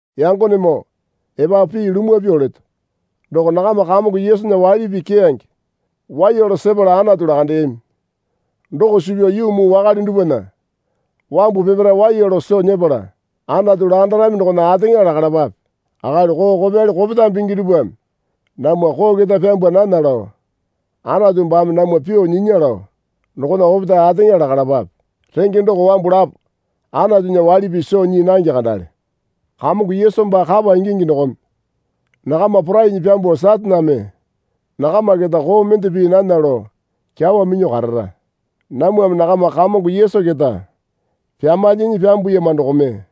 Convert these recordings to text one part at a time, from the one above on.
Yangonemoo epapu pii lumwa pyuo leto. Doko nakama Kamongo Yesunya waili pii keyange waiya lao sepala Anatu lakandeyami. Doko suu pyao yuu muu wakale dupwana wambu peparae waiya lao soo nyepala Anatu lakandarami dokona ateŋa lakalapape. Akali koo kopyali kopetame pingi dupwame namwa koo keta pyambwa nana lao Anatu baame namwa pyuo nyinya lao dokona opetae ateŋa lakalapapae. Renge doko wambu lapo Anatunya waili pii soo nyii nange kandale. Kamongo Yesu baa kapa ingingi dokome nakama porainyi pyambuo Sataneme nakama keta koo mende pii nana lao kyawa minyuo karara. Namwame nakama Kamongo Yesu keta pyamalyinyi pyambuyama dokome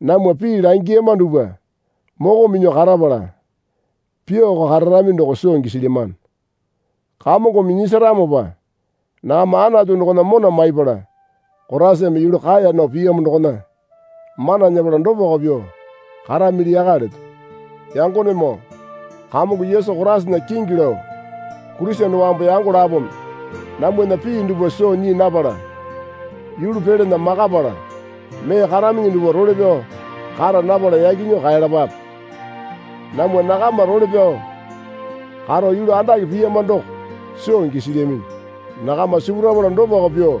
namwa pii langiyama dupwa moko minyuo karapala pyuoko kararami doko soo gisilyamano. Kamongome nyisaramopa nakama Anatu dokona mona maiyapala Koraisame yulu kaeya nao piyamo dokona mana nyepala dopako pyuo karamili yaka leto. Yangonemoo Kamongo Yesu Koraisana kingi lao Kurisene wambu yango lapome namwana pii dupwa soo nyii napala yulu pelana makapala mee karaminyi dupwa role pyao kara napala yaki nyuo kaelapape. Namwa nakama role pyao karo yulu andake piyama doko soo gisilyaminyi. Nakama sipurapala dopako pyuo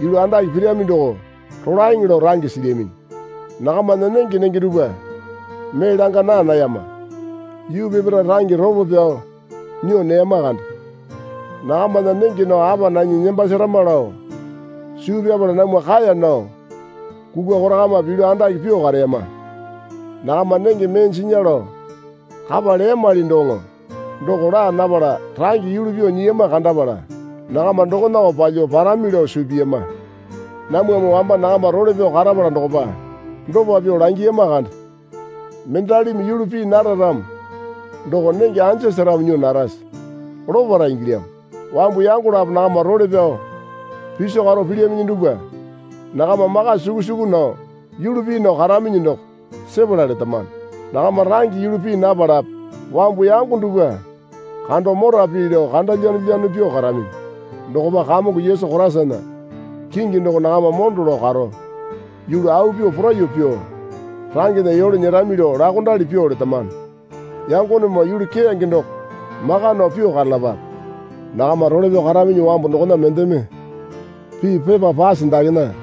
yulu andake pirami doko rolaeŋe lao range silyaminyi. Nakamana nenge nenge dupwa mee langa naa nayama. Yuu peparae range ropo pyao nyuo neyama kande. Nakamana nenge nao apa nanyi nembasarama lao suu pyapala namwa kaeya nao kukwa korakamape yulu andake pyuo kareyama. Nakama nenge mee jinya lao kapa leyamali doŋo doko laa napala range yulu pyuo nyiyama kandapala nakama dokonako palyuo parami lao suu piyama. Namwame wamba nakama role pyao karapala dokopa dopa pyuo langiyama kande. Mendalimi yulu pii nara ramo doko nenge anja seramo nyuo narase? Lopara ingilyamo. Wambu yango lapo nakama role pyao piso karo pilyaminyi dupwa nakama maka suku suku nao yulu pii nao karaminyi doko sepala letamano. Nakama range yulu pii napalape wambu yango dupwa kando mora pii lao kanda lyanolyano pyuo karaminyi. Dokopa Kamongo Yesu Koraisana kingi doko nakama mondo lao karo yulu au pyuo poraiyuo pyuo rangena yole nyerami lao laokondali pyuo letamano. Yangonemoo yulu keyange doko maka nao pyuo karalapape. Nakama role pyao karaminyi wambu dokona mendeme pii pepa pase dakena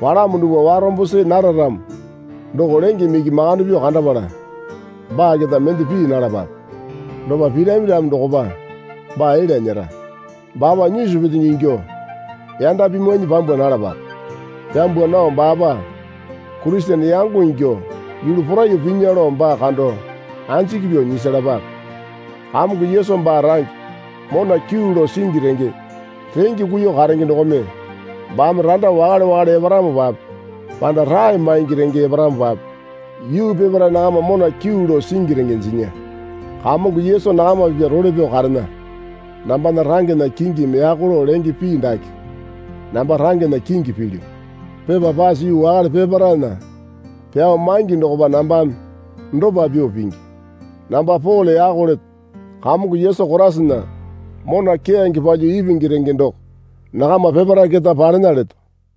palamo dupwa warombo see nara ramo doko lengeme iki makande pyuo kandapala baa keta mende pii nalapape. Dopa pirami ramo dokopa baa elya nyera. Baapa nyisu petenge ingyuo yanda pimwainyi pyambwa nalapape. Pyambwa nao baapa Kurisene yango ingyuo yulu poraiyuo pinya lao baa kando anjiki pyuo nyisalapape. Kamongo Yesu baa range mona kyuu lao singi renge renge kuiyuo karenge dokome baame randa wakale wakale eparamopape panda rae maingi renge eparamopape yuu peparae nakama mona kyuu lao singi renge jinya. Kamongo Yesu nakama pipya role pyao karena. Nambana rangena kingimi yako lao lenge pii dake namba rangena kingi pilyu. Pepa pase yuu wakale peparaena pyao maingi dokopa nambame dopa pyuo pingi. Namba Pole yako leto. Kamongo Yesu Koraisana mona keyange palyuo ipingi renge doko nakama peparae keta palena leto.